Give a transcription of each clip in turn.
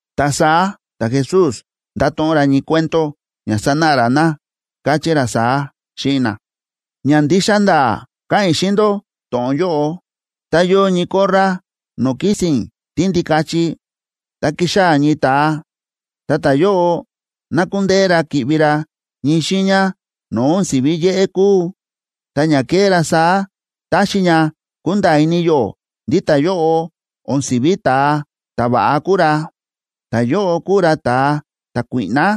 Ta saá ta̱Jesús nda̱to̱ꞌon ra ñii cuento ña sanáꞌa ra na, káchí ra saá xíꞌin na: ―Ña ndixa nda̱a̱ káꞌa̱n i̱ xíꞌin ndó to̱ꞌon yóꞌo. Tá yóo ñii korra no̱o̱ kísi̱n tíndikachi, ta ki̱xaa̱ ñii ta̱a, ta ta̱yóꞌo na̱kundeé ra ki̱ꞌvi ra ñii xiiña no̱o̱ o̱n si̱ví yéꞌé kúu, ta ña ke̱ꞌé ra saá táxi ña kunda̱a̱ ini yó ndí ta̱yóꞌo o̱n si̱ví ta̱a ta̱va̱ꞌa kúu ra, ta ta̱yóꞌo kúu ra ta̱a ta̱kuíꞌná.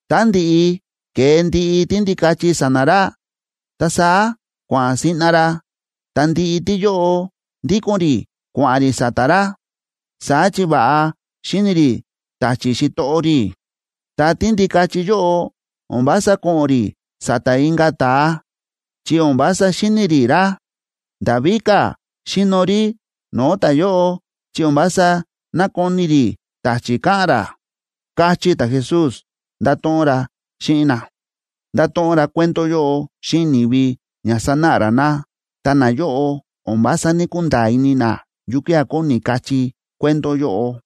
Tá ndi̱ꞌi ke̱e ndiꞌi tíndikachi sa̱na̱ ra, ta saá kua̱ꞌa̱n siꞌna ra, ta ndiꞌi tíyóꞌo ndíko̱n rí kua̱ꞌa̱n rí sa̱ta̱ ra. Saá chi va̱ꞌa xíni̱ rí ta̱chi̱ xitoꞌo rí. Ta tíndikachi yóꞌo o̱n vása ko̱ꞌo̱n rí sa̱ta̱ inka̱ ta̱a, chi o̱n vása xíni̱ rí ra. Nda̱ víka̱ xíno rí no̱o̱ ta̱yóꞌo, chi o̱n vása nákoni rí ta̱chi̱ káꞌa̱n ra ―káchí ta̱Jesús, nda̱to̱ꞌon ra xíꞌin na. Nda̱to̱ꞌon ra cuento yóꞌo xíꞌin ni̱vi ña sanáꞌa ra na, ta nayóꞌo o̱n vása ní‑kunda̱a̱ ini na yukía̱ kóni kachí cuento yóꞌo.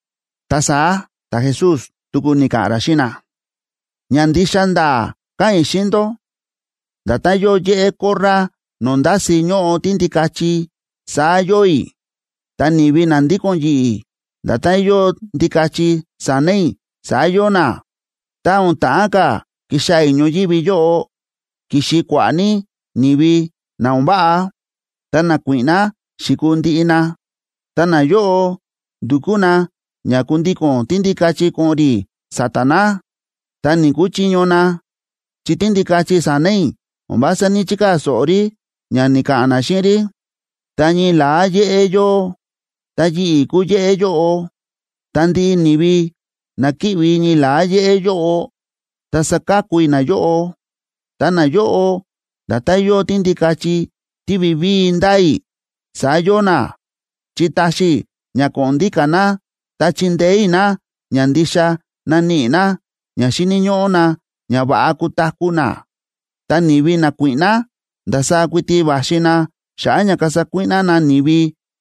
Ta saá ta̱Jesús tuku ni̱ka̱ꞌa̱n ra xíꞌin na: ―Ña ndixa nda̱a̱ káꞌa̱n i̱ xíꞌin ndó: Nda̱tán yóo yéꞌé korra no̱o̱ ndási ñóꞌo tíndikachi, saá yóo i̱. Ta ni̱vi na ndíko̱n yi̱ꞌi̱, nda̱tán yóo ndikachi sa̱na̱ i̱ saá yóo na. Ta o̱n ta̱ꞌán ka̱ kixaa̱ i̱ ñoyívi yóꞌo, ki̱xi kua̱ꞌa̱ ní ni̱vi na o̱n váꞌa, ta nakuíꞌná xi̱kuu ndiꞌi na. Ta nayóꞌo ndu̱kú na ña kundíko̱n tíndikachi ko̱ꞌo̱n rí sa̱ta̱ na, ta ní‑kuchiño na, chi tíndikachi sa̱na̱ i̱ o̱n vása ní‑chikaa̱ so̱ꞌo rí ña ni̱ka̱ꞌa̱n na xíꞌin rí. Ta ñii la̱á yéꞌé yóo, ta yi̱ꞌi̱ kúu yéꞌé yóꞌo. Ta ndiꞌi ni̱vi na kíꞌvi ñii la̱á yéꞌé yóꞌo, ta saka̱ku i̱ nayóꞌo. Ta nayóꞌo, nda̱tán yóo tíndikachi tí vivíi ndáa i̱, saá yóo na, chi táxi i̱ ña ko̱ꞌo̱n ndíka̱ na ta chindeé i̱ na ña ndixa naníꞌi na ña xíni̱ ñóꞌó na ña va̱ꞌa kutaku̱ na. ’Ta ni̱vi nakuíꞌná, ndasaá kuiti va̱xi na xa̱ꞌa̱ ña kasa kuíꞌná na ni̱vi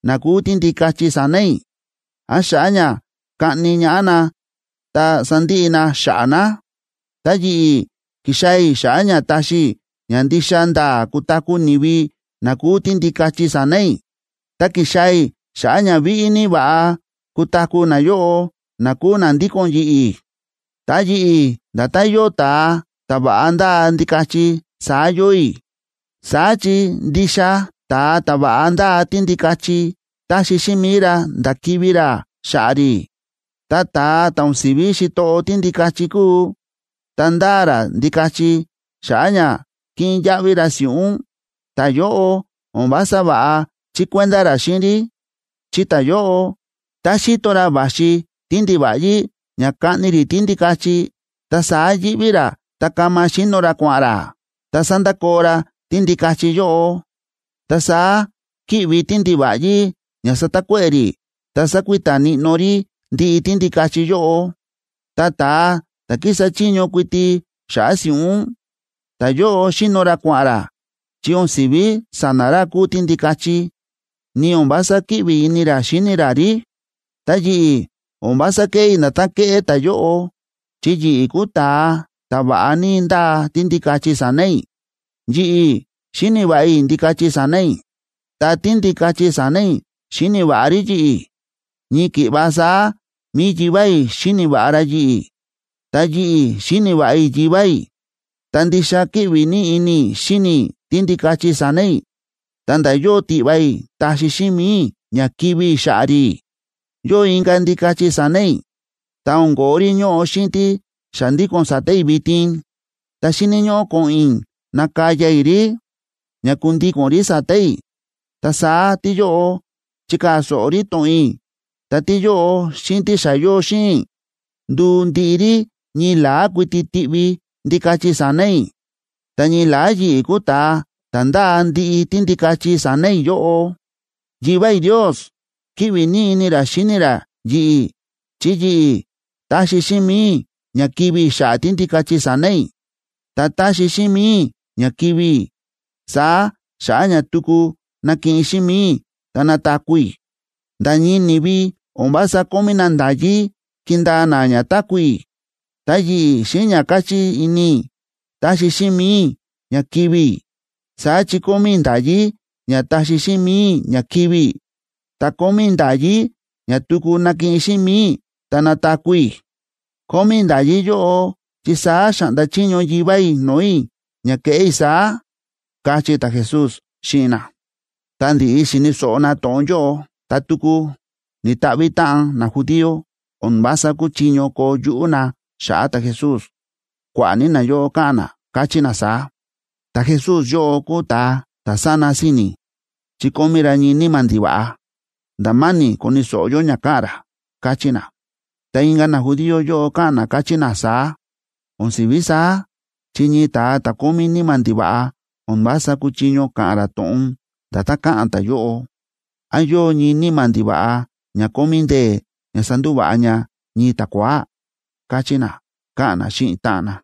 na kúu tíndikachi sa̱na̱ i̱, án xa̱ꞌa̱ ña kaꞌni ñaꞌá na ta sandiꞌi na xa̱ꞌa̱ na. Ta yi̱ꞌi̱, ki̱xaa̱ i̱ xa̱ꞌa̱ ña taxi i̱ ña ndixa nda̱a̱ kutaku̱ ni̱vi na kúu tíndikachi sa̱na̱ i̱, ta ki̱xaa̱ i̱ xa̱ꞌa̱ ña víꞌí ní va̱ꞌa kutaku̱ nayóꞌo na kúu na ndíko̱n yi̱ꞌi̱. Ta yi̱ꞌi̱ nda̱tán yóo ta̱a ta̱ va̱ꞌa ndáa ndikachi saá yóo i̱. Saá chi ndixa ta̱a ta̱ va̱ꞌa ndáa tíndikachi táxi xíꞌin mi̱i ra nda̱ kivi̱ ra xa̱ꞌa̱ rí. Ta ta̱a ta̱ o̱n si̱ví xitoꞌo tíndikachi kúu, ta ndáa ra ndikachi xa̱ꞌa̱ ña kiꞌin yaꞌvi ra si̱ꞌún, ta̱yóꞌo o̱n vása va̱ꞌa chíkuenda ra xíꞌin rí. Chi ta̱yóꞌo, tá xíto ra va̱xi tíndiva̱ꞌyí ña kaꞌni rí tíndikachi, ta saá yíꞌví ra ta kama xíno ra kua̱ꞌa̱n ra, ta sándakoo ra tíndikachi yóꞌo. Ta saá kíꞌvi tíndiva̱ꞌyí ña satakuéꞌe̱ rí, ta sákuita níꞌnó rí ndiꞌi tíndikachi yóꞌo. Ta ta̱a ta̱ kísa chiño kuiti xa̱ꞌa̱ si̱ꞌún, ta̱yóꞌo xíno ra kua̱ꞌa̱n ra, chi o̱n si̱ví sa̱na̱ ra kúu tíndikachi, ni o̱n vása kíꞌvi ini ra xíni ra rí. ’Ta yi̱ꞌi̱ o̱n vása kéꞌé i̱ nda̱tán kéꞌé ta̱yóꞌo, chi yi̱ꞌi̱ kúu ta̱a ta̱ va̱ꞌa ní ndáa tíndikachi sa̱na̱ i̱. Yi̱ꞌi̱ xíni̱ va̱ꞌa i̱ ndikachi sa̱na̱ i̱, ta tíndikachi sa̱na̱ i̱ xíni̱ va̱ꞌa rí yi̱ꞌi̱. Ñii ki̱ꞌva saá mi̱i Yivá i̱ xíni̱ va̱ꞌa ra yi̱ꞌi̱, ta yi̱ꞌi̱ xíni̱ va̱ꞌa i̱ Yivá i̱. Ta ndixa kíꞌvi ní ini i̱ xíni i̱ tíndikachi sa̱na̱ i̱, ta̱nda̱ yóo tiꞌva i̱ taxi xíꞌin mi̱i i̱ ña kivi̱ i̱ xa̱ꞌa̱ rí. Yóo inka̱ ndikachi sa̱na̱ i̱ ta o̱n ko̱ó rí ñóꞌo xíꞌin tí xa ndíko̱n sa̱ta̱ i̱ vitin. Ta xíni̱ ñóꞌó ko̱ꞌo̱n i̱ nakaya i̱ rí ña kundíko̱n rí sa̱ta̱ i̱. Ta saá tíyóꞌo chikaa̱ so̱ꞌo rí to̱ꞌon i̱, ta tíyóꞌo xíꞌin tí xa yóo xíꞌin i̱, nduu ndiꞌi rí ñii la̱á kuiti tiꞌvi ndikachi sa̱na̱ i̱, ta ñii la̱á yi̱ꞌi̱ kuu ta̱a ta̱ ndáa ndiꞌi tíndikachi sa̱na̱ i̱ yóꞌo. ’Yivá i̱ Ndios kíꞌvi ní ini ra xíni ra yi̱ꞌi̱ chi yi̱ꞌi̱ taxi xíꞌin mi̱i i̱ ña kivi̱ i̱ xa̱ꞌa̱ tíndikachi sa̱na̱ i̱. Ta taxi xíꞌin mi̱i i̱ ña kivi̱ i̱ saá xa̱ꞌa̱ ña tuku nakiꞌin xíꞌin mi̱i i̱ ta nataku̱ i̱. Nda̱ ñii ni̱vi o̱n vása kómí na nda̱yí kindaa na ña táku̱ i̱. Ta yi̱ꞌi̱ xíꞌin ña káchí ini i̱, taxi xíꞌin mi̱i i̱ ña kivi̱ i̱. Saá chi kómí i̱ nda̱yí ña taxi xíꞌin mi̱i i̱ ña kivi̱ i̱, ta kómí i̱ nda̱yí ña tuku nakiꞌin xíꞌin mi̱i i̱ ta nataku̱ i̱. Kómí i̱ nda̱yí yóꞌo chi saá xa̱ꞌnda chiño Yivá i̱ no̱o̱ i̱ ña keꞌé i̱ saá ―káchí ta̱Jesús xíꞌin na. Tá ndi̱ꞌi xi̱ni̱ so̱ꞌo na to̱ꞌon yóꞌo, ta tuku ni̱ta̱ꞌvi̱ táꞌan najudío. O̱n vása kúchiño koo yuꞌú na xa̱ꞌa̱ ta̱Jesús. Kua̱ꞌa̱ ní nayóꞌo káꞌa̱n na, káchí na saá: ―Ta̱Jesús yóꞌo kúu ta̱a ta̱ sána si̱ni̱, chi kómí ra ñii níma̱ ndiva̱ꞌa. Nda̱ ma̱ni̱ koni̱ so̱ꞌo yó ña káꞌa̱n ra ―káchí na. Ta inka̱ najudío yóꞌo káꞌa̱n na, káchí na saá: ―O̱n si̱ví saá, chi ñii ta̱a ta̱ kómí níma̱ ndiva̱ꞌa o̱n vása kúchiño ka̱ꞌa̱n ra to̱ꞌon nda̱tán káꞌa̱n ta̱yóꞌo. ¿Án yóo ñii níma̱ ndiva̱ꞌa ña kómí ndee̱ ña sandúva̱ꞌa ña ñii ta̱kua̱á? ―káchí na, káꞌa̱n na xíꞌin táꞌan na.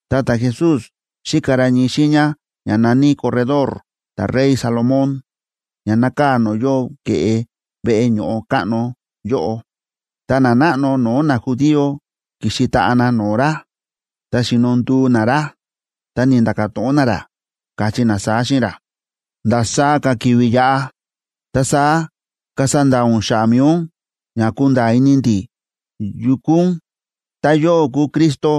Ta ta̱Jesús xíka ra ñii xiiña ña na̱ní Corredor ta̱rey Salomón, ña nákaa̱ no̱o̱ yóo ke̱ꞌe veꞌe ño̱ꞌo káꞌno yóꞌo. Ta nanáꞌno no̱o̱ najudío ki̱xi taꞌa na no̱o̱ ra, ta xi̱no nduu na ra, ta ni̱nda̱ka̱ to̱ꞌon na ra, káchí na saá xíꞌin ra: ―¿Ndasaá ka̱ ki̱vi̱ yaꞌa, ta saá kasa nda̱a̱ ún xa̱ꞌa̱ mi̱i ún ña kunda̱a̱ ini ndi̱ yu kúu ún? Tá yóꞌó kúu Cristo,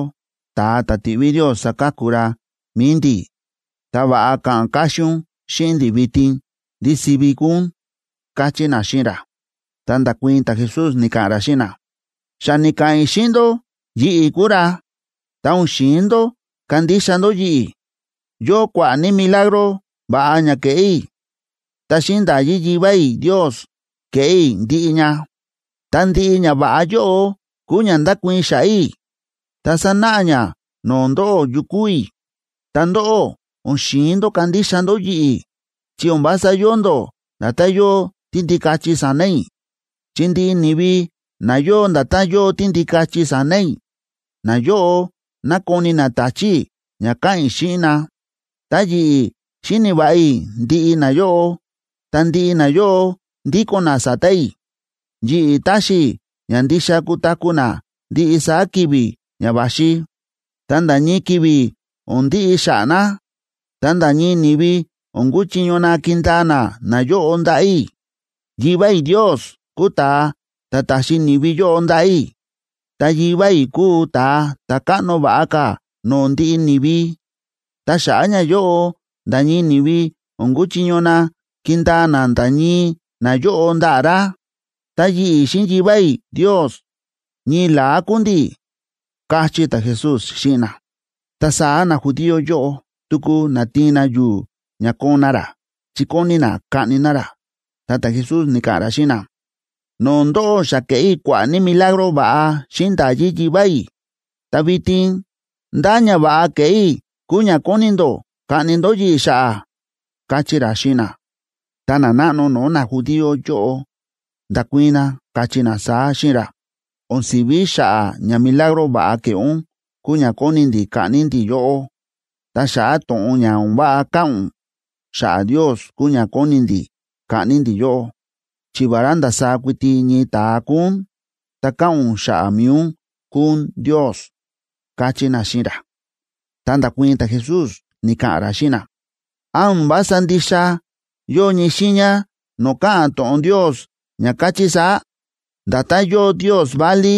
ta̱a ta̱ ti̱ꞌví Ndios saka̱ku ra mi̱i ndi̱, ta va̱ꞌa ka̱ꞌa̱n káxín ún xíꞌin ndi̱ vitin ndí sivi kúu ún ―káchí na xíꞌin ra. Ta nda̱kuii̱n ta̱Jesús, ni̱ka̱ꞌa̱n ra xíꞌin na: ―Xa ni̱ka̱ꞌa̱n i̱ xíꞌin ndó yi̱ꞌi̱ kúu ra, ta o̱n xi̱in ndó kandixa ndó yi̱ꞌi̱. Yóo kua̱ꞌa̱ ní milagro va̱ꞌa ña kéꞌé i̱, ta xíꞌin nda̱yí Yivá i̱ Ndios kéꞌé i̱ ndiꞌi ña. Ta ndiꞌi ñava̱ꞌa yóꞌo kúu ña ndákuii̱n xa̱ꞌa̱ i̱ ta sánáꞌa ña no̱o̱ ndóꞌó yu kúu i̱. Ta ndóꞌó, o̱n xi̱in ndó kandixa ndó yi̱ꞌi̱ chi o̱n vása yóo ndó nda̱tán yóo tíndikachi sa̱na̱ i̱. Chi ndiꞌi ni̱vi na yóo nda̱tán yóo tíndikachi sa̱na̱ i̱, nayóꞌo nákoni na ta̱chi̱ i̱ ña káꞌa̱n i̱ xíꞌin na. Ta yi̱ꞌi̱, xíni̱ va̱ꞌa i̱ ndiꞌi nayóꞌo, ta ndiꞌi nayóꞌo ndíko̱n na sa̱ta̱ i̱. Yi̱ꞌi̱ táxi i̱ ña ndixa kutaku̱ na ndiꞌi saá ki̱vi̱ ña va̱xi, ta nda̱ ñii ki̱vi̱ o̱n ndiꞌi xa̱ꞌa̱ na. Ta nda̱ ñii ni̱vi o̱n kuchiño na kindaa na nayóꞌo ndaꞌa̱ i̱. Yivá i̱ Ndios kúu ta̱a ta̱ ta̱xi ni̱vi yóꞌo ndaꞌa̱ i̱. Ta Yivá i̱ kúu ta̱a ta̱ káꞌno va̱ꞌa ka̱ no̱o̱ ndiꞌi ni̱vi. Ta xa̱ꞌa̱ ñayóꞌo, nda̱ ñii ni̱vi o̱n kuchiño na kindaa na nda̱ ñii nayóꞌo ndaꞌa̱ ra. Ta yi̱ꞌi̱ xíꞌin Yivá i̱ Ndios, ñii la̱á kúu ndi̱ ―káchí ta̱Jesús xíꞌin na. Ta saá najudío yóꞌo tuku na̱tiin na yu̱u̱ ña koon na ra, chi kóni na kaꞌni na ra. Ta ta̱Jesús ni̱ka̱ꞌa̱n ra xíꞌin na: ―No̱o̱ ndóꞌó xa ke̱ꞌé i̱ kua̱ꞌa̱ ní milagro va̱ꞌa xíꞌin nda̱yí Yivá i̱. Ta vitin, ¿ndá ñava̱ꞌa ke̱ꞌé i̱ kúu ña kóni ndó kaꞌni ndó yi̱ꞌi̱ xa̱ꞌa̱? ―káchí ra xíꞌin na. Ta nanáꞌno no̱o̱ najudío yóꞌo nda̱kuii̱n na, káchí na saá xíꞌin ra: ―O̱n si̱ví xa̱ꞌa̱ ña milagro va̱ꞌa ke̱ꞌé ún kúu ña kóni ndi̱ kaꞌni ndi̱ yóꞌó, ta xa̱ꞌa̱ to̱ꞌon ña o̱n váꞌa káꞌa̱n ún xa̱ꞌa̱ Ndios kúu ña kóni ndi̱ kaꞌni ndi̱ yóꞌó, chi vará ndasaá kuiti ñii ta̱a kúu ún, ta káꞌa̱n ún xa̱ꞌa̱ mi̱i ún kúu ún Ndios ―káchí na xíꞌin ra. Ta nda̱kuii̱n ta̱Jesús, ni̱ka̱ꞌa̱n ra xíꞌin na: ―¿Án o̱n vása ndixa yóo ñii xiiña no̱o̱ káꞌa̱n to̱ꞌon Ndios ña káchí saá: “Nda̱tán yóo ndios válí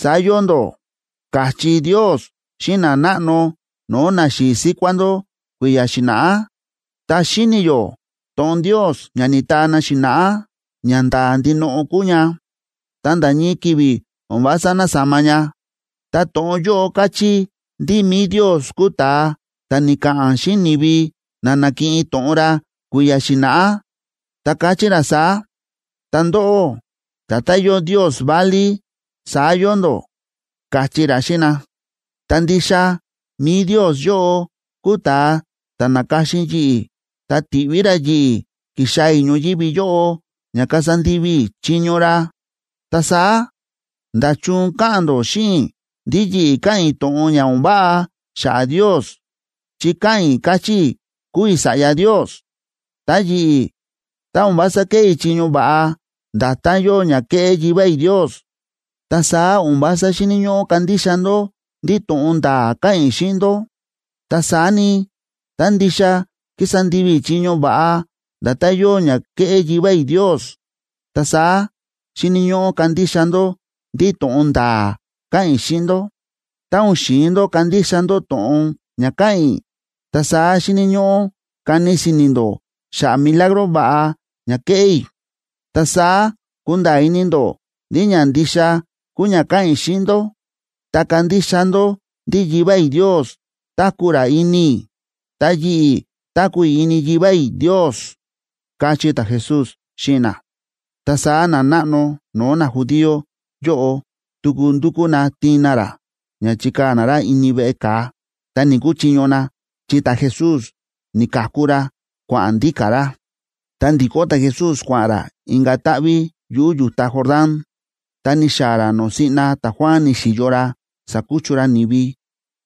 saá yóo ndó”?, káchí Ndios xíꞌin nanáꞌno no̱o̱ naxi̱i̱ síkuá ndó kui̱ya̱ xi̱na̱ꞌá. Ta xíni̱ yó to̱ꞌon Ndios ña ni̱taa na xi̱na̱ꞌá ñanda̱a̱ ndinoꞌo kúu ña, ta nda̱ ñii ki̱vi̱ o̱n vása násama ña. Ta to̱ꞌon yóꞌo káchí ndí mi̱i Ndios kúu ta̱a ta̱ ni̱ka̱ꞌa̱n xíꞌin ni̱vi na na̱kiꞌin to̱ꞌon ra kui̱ya̱ xi̱na̱ꞌá, ta káchí ra saá: “Ta ndóꞌó, nda̱tán yóo ndios válí, saá yóo ndó”, káchí ra xíꞌin na. Ta ndixa mi̱i Ndios yóꞌo kúu ta̱a ta̱ na̱ka̱xin yi̱ꞌi̱, ta ti̱ꞌví ra yi̱ꞌi̱ ki̱xaa̱ i̱ ñoyívi yóꞌo ña kasa ndivi i̱ chiño ra. Ta saá, ¿nda̱chun káꞌa̱n ndó xíꞌin i̱ ndí yi̱ꞌi̱ káꞌa̱n i̱ to̱ꞌon ña o̱n váꞌa xa̱ꞌa̱ Ndios chi káꞌa̱n i̱, káchí i̱ kúu i̱ Sa̱ꞌya Ndios? Ta yi̱ꞌi̱, tá o̱n vása kéꞌé i̱ chiño va̱ꞌa, nda̱tán yóo ña kéꞌé Yivá i̱ Ndios, ta saá o̱n vása xíni̱ ñóꞌó kandixa ndó ndí to̱ꞌon nda̱a̱ káꞌa̱n i̱ xíꞌin ndó. Ta saá ni, tá ndixa kísa ndivi i̱ chiño va̱ꞌa nda̱tán yóo ña kéꞌé Yivá i̱ Ndios, ta saá xíni̱ ñóꞌó kandixa ndó ndí to̱ꞌon nda̱a̱ káꞌa̱n i̱ xíꞌin ndó. Tá o̱n xi̱in ndó kandixa ndó to̱ꞌon ña káꞌa̱n i̱, ta saá xíni̱ ñóꞌó kani si̱ni̱ ndó xa̱ꞌa̱ milagro va̱ꞌa ña kéꞌé i̱. Ta saá kunda̱a̱ ini ndó ndí ña ndixa kúu ña káꞌa̱n i̱ xíꞌin ndó, ta kandixa ndó ndí Yivá i̱ Ndios táku̱ ra ini i̱, ta yi̱ꞌi̱ táku̱ i̱ ini Yivá i̱ Ndios ―káchí ta̱Jesús xíꞌin na. Ta saá nanáꞌno no̱o̱ najudío yóꞌo tuku ndu̱kú na tiin na ra ña chikaa̱ na ra ini veꞌe ka̱a, ta ni̱‑kuchiño na, chi ta̱Jesús ni̱ka̱ku ra, kua̱ꞌa̱n ndíka̱ ra. Ta ndi̱kó ta̱Jesús, kua̱ꞌa̱n ra inka̱ táꞌví yuꞌu̱ yu̱ta Jordán, ta ni̱xaa̱ ra no̱o̱ siꞌna ta̱Juan ni̱xi̱yo ra, sákuchu ra ni̱vi,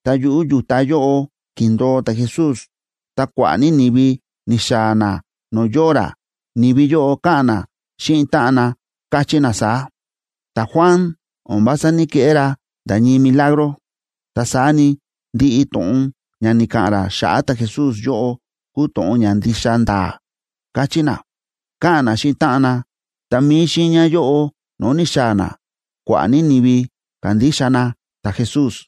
ta yuꞌu̱ yu̱ta yóꞌo ki̱ndo̱o ta̱Jesús. Ta kua̱ꞌa̱ ní ni̱vi ni̱xaa̱ na no̱o̱ yóo ra. Ni̱vi yóꞌo káꞌa̱n na xíꞌin táꞌan na, káchí na saá: ―Ta̱Juan o̱n vása ní‑keꞌé ra nda̱ ñii milagro, ta saá ni, ndiꞌi to̱ꞌon ña ni̱ka̱ꞌa̱n ra xa̱ꞌa̱ ta̱Jesús yóꞌo kúu to̱ꞌon ña ndixa nda̱a̱ ―káchí na, káꞌa̱n na xíꞌin táꞌan na. Ta mi̱i xiiña yóꞌo no̱o̱ ni̱xaa̱ na, kua̱ꞌa̱ ní ni̱vi ka̱ndixa na ta̱Jesús.